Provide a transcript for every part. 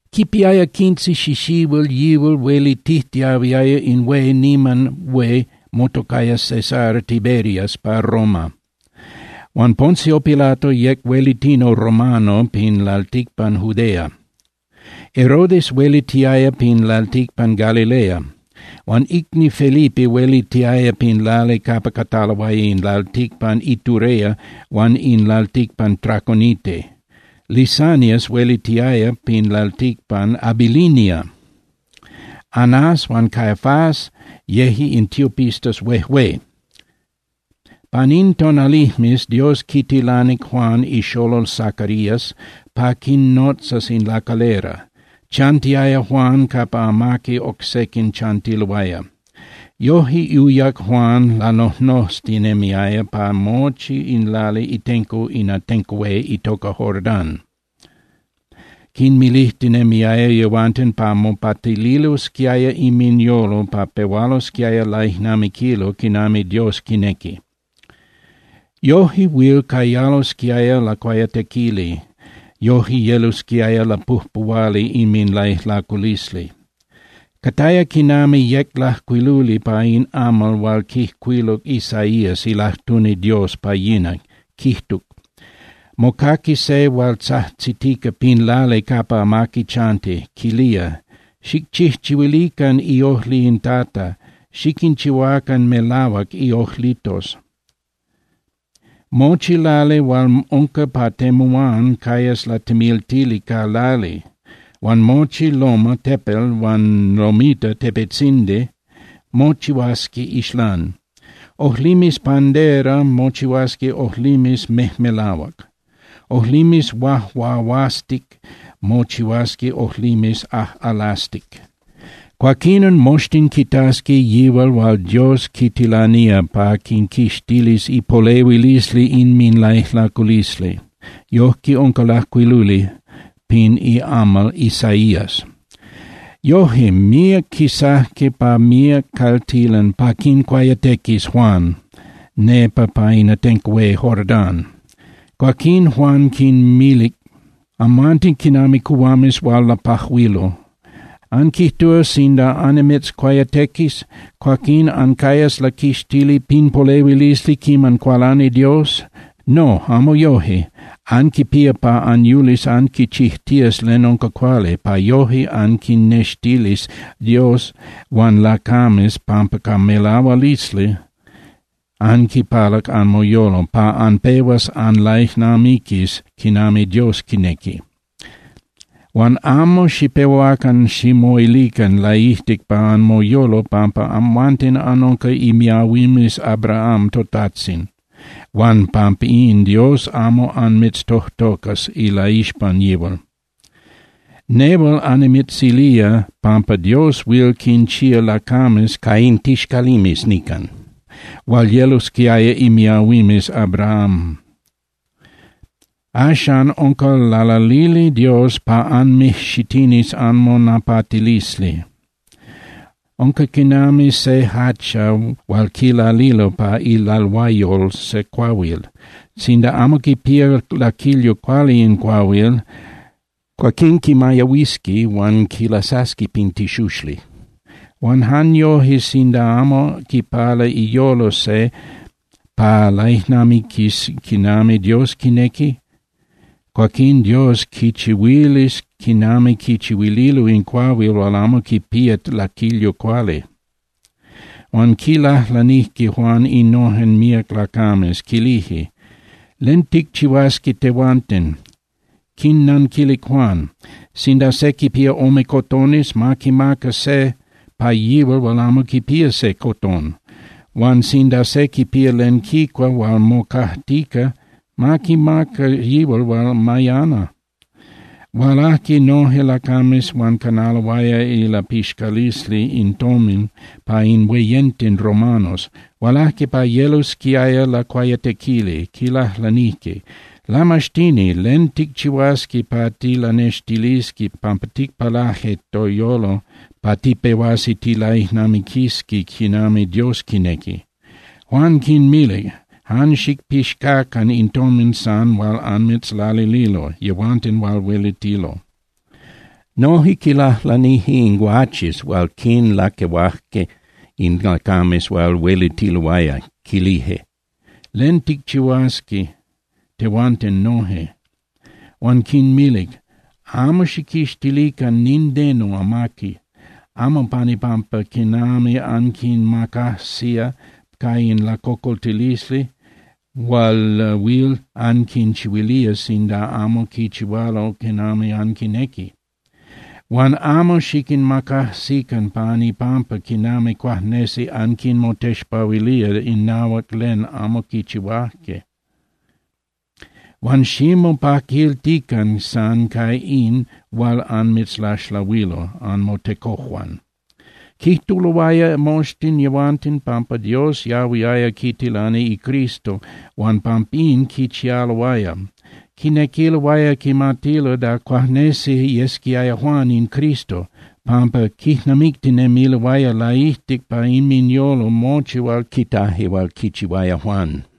Quipiaya quince xixihuil yihual huelitijtiahuiaya in hué niman hué motocaya César Tiberias pa Roma. Huan Poncio Pilato yec huelitini romano pin lalticpan Judea, Herodes huelitiaya pin lalticpan Galilea, huan icni Felipe huelitiaya pin lali capa cataloaya in lalticpan Iturea huan in lalticpan Traconite. Lisanias huelitiaya pin lalticpan Abilinia. Anás huan Caifás yeje in tiopistas huejué. Pan in tonalijmes, Dios quitilanic Juan ixolol Zacarías pa quinnotzas in lacalera. Chantiaya Juan capa amaqui oc sequin chantiloaya. Yoje uyac Juan lanojnoztinemiaya pa mochi in lali itenco in atenco hué itoca Jordán, quinmilijtinemiaya yehuanten pa mopatililosquiaya inminyolo pa pehualosquiaya laijnamiquilo quinami Dios quinequi. Yoje huil cayalosquiaya lacuayatequili, yoje yelosquiaya lapujpuhuali inminlaijlaculisli. Cataya quinami yec lajcuiluli pa in amal hual quijcuiluc Isaías ilajtuni Dios pa yina, quijtuc: Mocaqui se hual tzajtzitica pin lali capa amaqui chanti, quilía: “Xicchijchihuilican iojli in Tata, xiquinchihuacan melahuac iojlitos. Mochi lali hual unca pa temuán cayas latemiltili ca lali, huan mochi loma (tepel) huan lomita (tepetzindi) mochihuasqui ixlán. Ojlimes pandera mochihuasqui ojlimes mejmelahuac. Ojlimes huajuahuastic mochihuasqui ojlimes ajꞌalastic. Cuaquinon moxtin quitasqui yihual hual Dios quitilanía pa quinquixtilis ipolehuilisli inminlaijlaculisli.” Yojque unca lajcuiluli pin iamal Isaías. Yoje, míac quisajque pa míac caltilan pa quincuayatequis Juan nepa pa in atenco hué Jordán. Cuaquín Juan quinmilic: —¡Amhuanten quinami cuhuames hual lapajuilo! ¿Anquijtúa sinda annimitzcuayatequis, cuaquín ancayas laquixtili pin polehuilisli quiman cualani Dios? No, amo yoje. Anquipía pa anyulis anquichijtías len unca cuali, pa yoje anquinnextilis Dios huan lacames pampa ca melahualisli anquipalac anmoyolo pa anpehuas anlaijnamiquis quinami Dios quinequi. Huan amo xipehuacan ximoilican laijtic pa anmoyolo pampa amhuanten anunca imiahuimes Abraham totajtzin huan pampín Dios amo anmitztojtocas ilaixpan yihual. Nehual annimitzilía pampa Dios huil quinchía lacames ca in tixcalimes nican hual yelosquiaya imiahuimes Abraham. Axcan unca lalalili Dios pa anmijxitinis anmonapatilisli. Unca quinami se hacha hual quilalilo pa ilalhuayol se cuahuil. Sinda amo quipía laquilyo cuali in cuahuil, cuaquín quimayahuisqui huan quilasasqui pin tixuxli. Huan jan yoje sinda amo quipala iyolo se pa laijnamiquis quinami Dios quinequi, cuaquín Dios quichihuilis quinami quichihuililo in cuahuil hual amo quipía laquilyo cuali. Huan quilajlanijque Juan innojen míac lacames, quilije: —¿Len ticchihuasqui tehuanten? Quinnanquilic Juan: —Sinda se quipía ome cotones, ma quimaca se pa yihual hual amo quipía se cotón. Huan sinda se quipía len quicua hual mocajtica, ma quimaca yihual hual mayana. Hualajque noje lacames hual canaloaya ilapixcalisli in tomin pa in hueyenten romanos. Hualajque pa yelosquiaya lacuayatequili, quilajlanijque: —Lamaxtini, ¿len ticchihuasqui pa tilanextilisqui pampa ticpalaje toyolo pa tipehuasi tilaijnamiquisqui quinami Dios quinequi? Juan quinmilic: —Jan xicpixcacan in tomin san hual anmitzlalililo yehuanten hual huelitilo. Noje quilajlanije in guaches hual quinlaquehuajque in lacames hual huelitiloaya, quilije: —¿Len ticchihuasqui tehuanten noje? Huan quinmilic: —Amo xijquixtilican nindeno amaqui, amo pan ipampa quinami anquinmacajsía ca in lacocoltilisli hual huil anquinchihuilía sinda amo quichihualo quinami anquinequi. Huan amo xiquinmacajsican pan ipampa quinami cuajnesi anquinmotexpahuilía inahuac len amo quichihuaje. Huan ximopaquiltican san ca in hual anmitzlaxlahuilo anmotecojuan. Quijtuloaya moxtin yehuanten pampa Dios yahuiaya quitilani iCristo huan pampín quichialoaya. Quinequiloaya quimatilo da cuajnesi yesquiaya Juan in Cristo, pampa quijnamictinemiloaya laijtic pa inminyolo mochi hual quitaje hual quichihuaya Juan.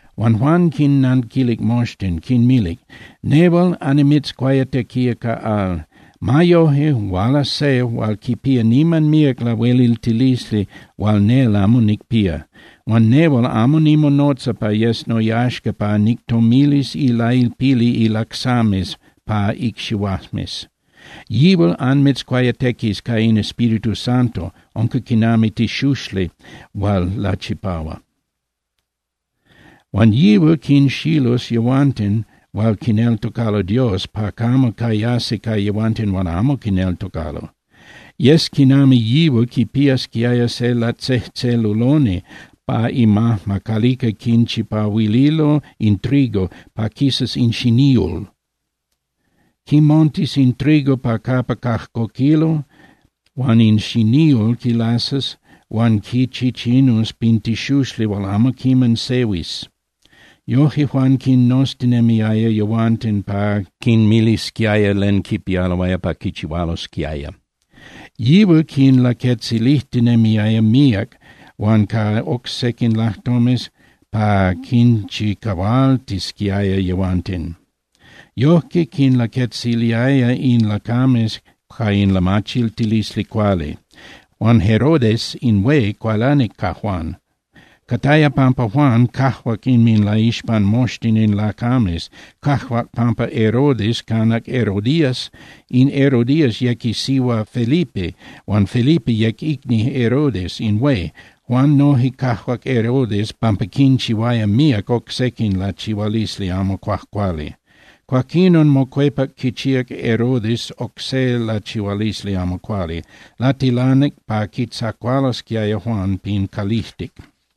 Huan Juan quinnanquilic moxtin, quinmilic: —Nehual annimitzcuayatequía ca al. Ma yoje, hualas se hual quipía niman míac lahueliltilisli hual nel amo nicpía. Huan nehual amo nimonotza pa yes noyaxca pa nictomilis ilailpili ilacsames pa icxihuajmes. Yihual anmitzcuayatequis ca in Espíritu Santo, unca quinami tixuxli hual lachipahua. Huan yihual quinxilus yehuanten hual quineltocalo Dios pa camo cayasi ca yehuanten hual amo quineltocalo. Yes quinami yihual quipiasquiaya se latzejtzeluloni pa imajma calica quichipahuililo in trigo pa quisas in xiníul. Quimontus in trigo pa capa cajcoquilo huan in xiníul quilasas huan quichichinus pin tixuxli hual amo quiman sehuis. Yojque Juan quinnoztinemiaya yehuanten pa quinmilisquiaya len quipialoaya pa quichihualosquiaya. Yihual quinlaquetzilijtinemiaya míac huan ca oc sequin lajtomes pa quinchicahualtisquiaya yehuanten. Yojque quinlaquetziliaya in lacames ca in lamachiltilisli cuali. Huan Herodes in hué cualanic ca Juan. Cataya pampa Juan cajuac inminlaixpan moxtin in lacames, cajuac pampa Herodes canac Herodías. In Herodías yec isihua Felipe huan Felipe yec icni Herodes in hué. Juan noje cajuac Herodes pampa quinchihuaya míac oc sequin lachihualisli amo cuajcuali. Cuaquinon mocuepac quichíac Herodes oc se lachihualisli amo cuali. Latilanic pa quitzacualosquiaya Juan pin calijtic.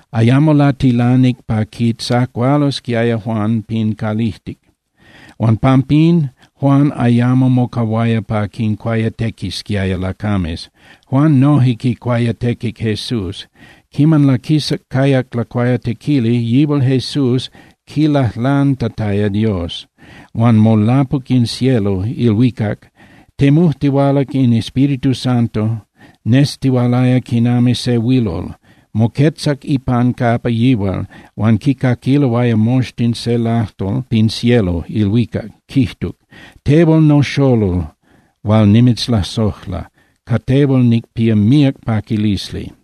Ayamo latilanic pa quitzacualosquiaya Juan pin calijtic, huan pampín, Juan ayamo mocahuaya pa quincuayatequisquiaya lacames. Juan noje quicuayatequic Jesús. Quiman laquisac cayac lacuayatequili, yihual Jesús quilajlantataya Dios, huan molapuc in cielo (ilhuicac). Temujtihualac in Espíritu Santo nestihualaya quinami se huilol. Moquetzac ipan capa yihual, huan quicaquiloaya moxtin se lajtol pin cielo (ilhuicac), quijtuc: —Tehual noxolol hual nimitzlasojla, ca tehual nicpía míac paquilisli.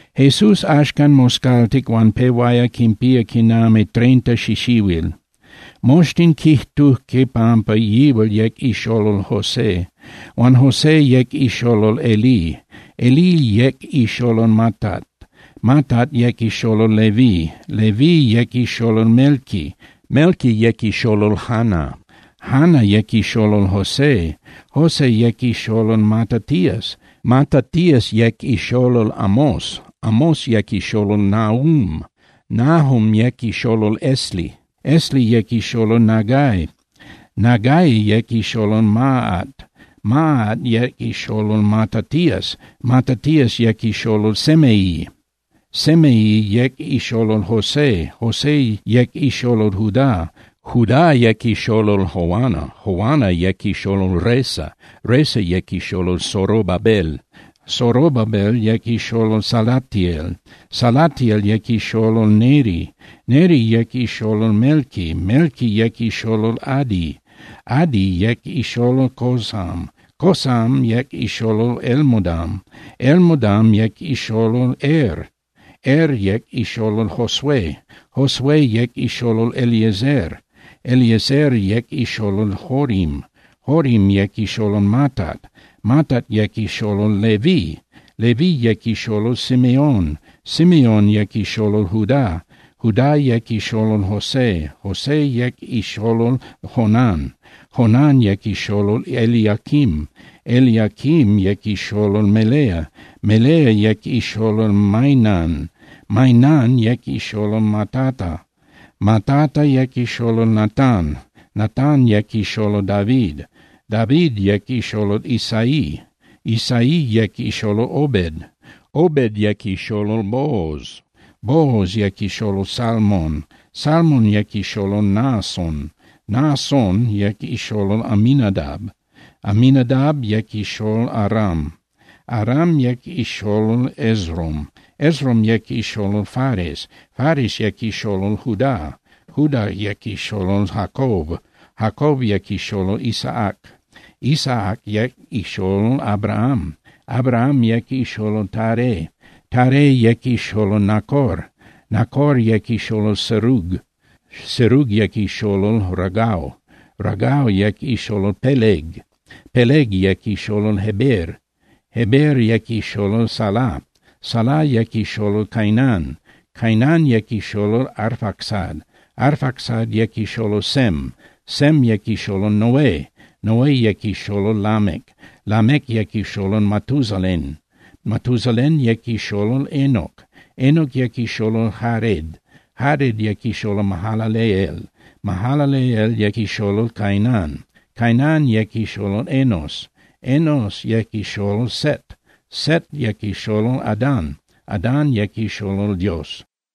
Jesús axcan moscaltic huan pehuaya quinpía quinami treinta xixihuil. Moxtin quijtujque pampa yihual yec ixolol José. Huan José yec ixolol Elí. Elí yec ixolol Matat, Matat yec ixolol Leví, Leví yec ixolol Melqui, Melqui yec ixolol Jana, Jana yec ixolol José. José yec ixolol Matatías, Matatías yec ixolol Amós, Amós yec ixolol Nahum, Nahum yec ixolol Esli, Esli yec ixolol Nagai. Nagai yec ixolol Maat, Maat yec ixolol Matatías, Matatías yec ixolol Semei, Semei yec ixolol José, José yec ixolol Judá. Judá yec ixolol Joana, Joana yec ixolol Resa, Resa yec ixolol Zorobabel, Zorobabel yec ixolol Salatiel, Salatiel yec ixolol Neri. Neri yec ixolol Melqui, Melqui yec ixolol Adi, Adi yec ixolol Cosam, Cosam yec ixolol Elmodam, Elmodam yec ixolol Er. Er yec ixolol Josué, Josué yec ixolol Eliezer, Eliezer yec ixolol Jorim, Jorim yec ixolol Matat, Matat yec ixolol Leví. Leví yec ixolol Simeon, Simeon yec ixolol Judá, Judá yec ixolol José, José yec ixolol Jonán, Jonán yec ixolol Eliaquim. Eliaquim yec ixolol Melea, Melea yec ixolol Mainán, Mainán yec ixolol Matata, Matata yec ixolol Natán, Natán yec ixolol David. David yec ixolol Isaí, Isaí yec ixolol Obed, Obed yec ixolol Booz, Booz yec ixolol Salmon, Salmon yec ixolol Naasón. Naasón yec ixolol Aminadab, Aminadab yec ixolol Aram, Aram yec ixolol Esrom, Esrom yec ixolol Fares, Fares yec ixolol Judá, Judá yec ixolol Jacob. Jacob yec ixolol Isaac, Isaac yec ixolol Abraham, Abraham yec ixolol Taré, Taré yec ixolol Nacor. Nacor yec ixolol Serug, Serug yec ixolol Ragau, Ragau yec ixolol Peleg, Peleg yec ixolol Heber, Heber yec ixolol Sala. Sala yec ixolol Cainán Cainán yec ixolol Arfacsad, Arfacsad yec ixolol Sem, Sem yec ixolol Noé, Noé yec ixolol Lamec. Lamec yec ixolol Matusalén, Matusalén yec ixolol Enoc, Enoc yec ixolol Jared, Jared yec ixolol Mahalaleel, Mahalaleel yec ixolol Cainán. Cainán yec ixolol Enos, Enos yec ixolol Set, Set yec ixolol Adán, Adán yec ixolol Dios.